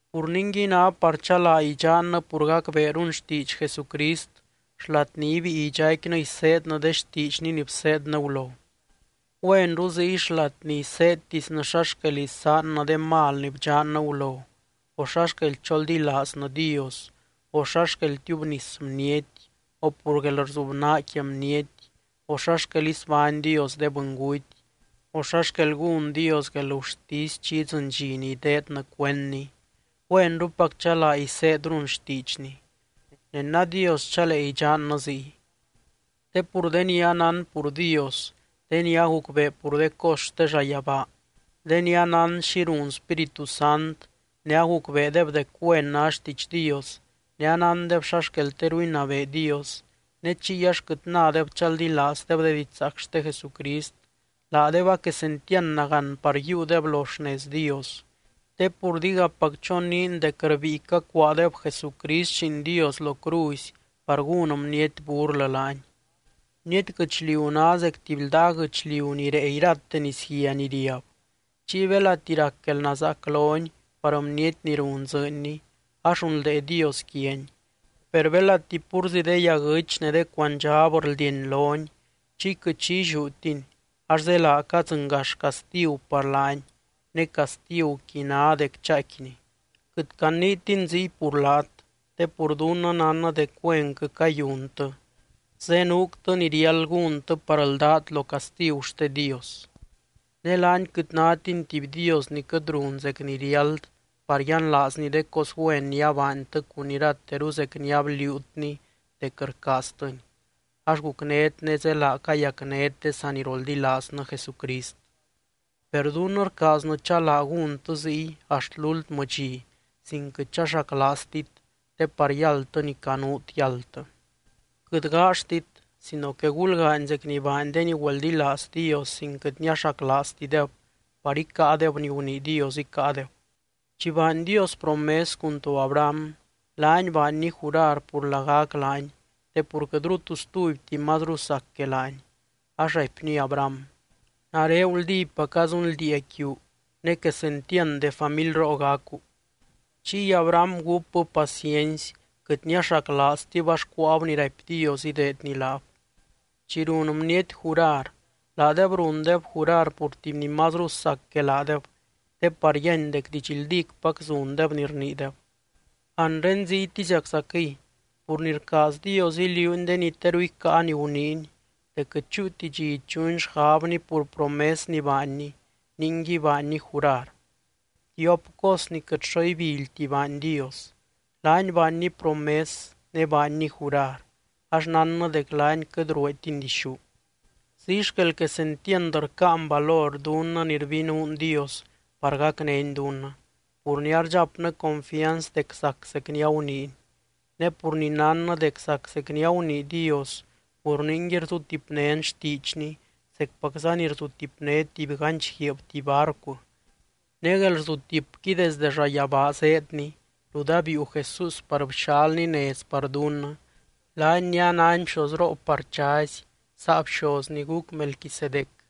Pur ningui, ná par chalaa idxannɨ pur gacbeerun xtiidx Jesucrist xlat ni ibíi idxaicquinɨ iseednɨ de xtiidxny ni bseednɨ gulo. Güenru ziy xlat ni iseedtisnɨ xa xquel isaannɨ de mal ni bdxannɨ gulo, o xa xquel choldilaaznɨ Dios, o xa xquel tiubnis bniety, o pur guelrzubnaa quia bniety, o xa xquel isbány Dios de bɨnguty, o xa xquel gún Dios guelgurtisy chi idzɨny dxi ni ideednɨ cuendny, güenrupac chalaa iseedrun xtiidxny. Ne nadios chalee idxannɨ ziy. Te pur de ni anán pur Dios, de ni agucbee pur de cos xte llayabaa, de ni anán xi run Spíritu Sant, ne agucbeedeb dec güen ná xtiidx Dios, ne anándeb xa xquel teru inabee Dios, ne chiy ax quɨt nadeb chaldilaazdeb de didxzaac xte Jesucrist, laadeb a quesentiand nagán par yiiudeb lo xnez Dios, te pur digapac choniin dec rbíi cacuaadeb Jesucrist Lliin Dios lo cruzy par gún bniety burlɨ laany. Bniety guɨchliu ná zec tuby ldaa guɨchliu ni rée irate nisguia ni riab, chiy belati rac guelnazaac loni par bniety ni run dzɨɨnni ax runldee Dios quiani. Per belati púrzi de yaguɨ́ch ne de cuandxab rldieny loni chiy quɨt xi illiútini, ax zélaa cadzɨngax castigu par laani ne castiguqui ná dec chaaicquini. Quɨt caniitin ziy pur laat te pur dunnɨ nánnɨ dec güenquɨ cayuntɨ, zenuuctɨ ni riáld gúntɨ par ldát lo castigu xte Dios. Ne laany quɨt nátiny tuby Dios ni quɨt run zec ni riáld par yianlaazny de cos güen ni abaantɨ cun irateru zec ni abliuutny dec rcaaztɨny, ax gucnét ne zélaa cayacnét de saniroldilaaznɨ Jesucrist. Per dunnɨ rcaaznɨ chalaa gúntɨ ziy axt lúltmɨ dxi, sin quɨt chaxaclaaztit, te par yáldtɨ ni canuut yáldtɨ. Quɨt gaaxtit sino que gulgaany zec ni baany de ni güeldilaaz Dios sin quɨt niaxaclaaztideb par icáadeb ni gunii Dios icáadeb. Chi baany Dios promes cun to Abraham, laany baanny jurar pur lagac laany te pur quɨtru tu stubyti mazru sac que laany, ax raipny Abraham: “Nare guldípaca zunldiia quiu ne quesentiand de familroo gacu.” Chiy Abraham gúpbɨ paciency, quɨt niaxaclaaztib ax cuáab ni raipy Dios ideedny laab. Chi run bniety jurar, laadeb rundeb jurar pur tuby ni mazru sac que laadeb, te par yíany dec didxldícpac zundeb ni rniideb. Anre ziytiziaczaquɨy, pur ni rcaaz Dios iliuuny de ni teru icáa ni guniiny, dec quɨt chúuti dxi ichuny xgabny pur promes ni baanny, ningui baanny jurar. Tiop cos ni quɨt xo ibilyti baany Dios, laany baanny promes ne baanny jurar ax nánnɨ dec laany quɨt rueetiny dixú. Ziy xquel quesentiand rcáan valor dunnɨ ni rbinuun Dios par gacnény dunnɨ, pur ni ardxapnɨ confianz dec zac zec ni aguniiny. Ne pur ni nánnɨ dec zac zec ni agunii Dios, pur ningui rzutipnén xtiidxny zecpacza ni rzutipné tuby ganch guiib tuby barcu. Ne guelrzutipqui desdɨ llayabaa zéedni rut abiiu Jesús par bxalny nez par dunnɨ, laany ni anány bxozroo par chazy, saa bxoz ni guc Melquisedec.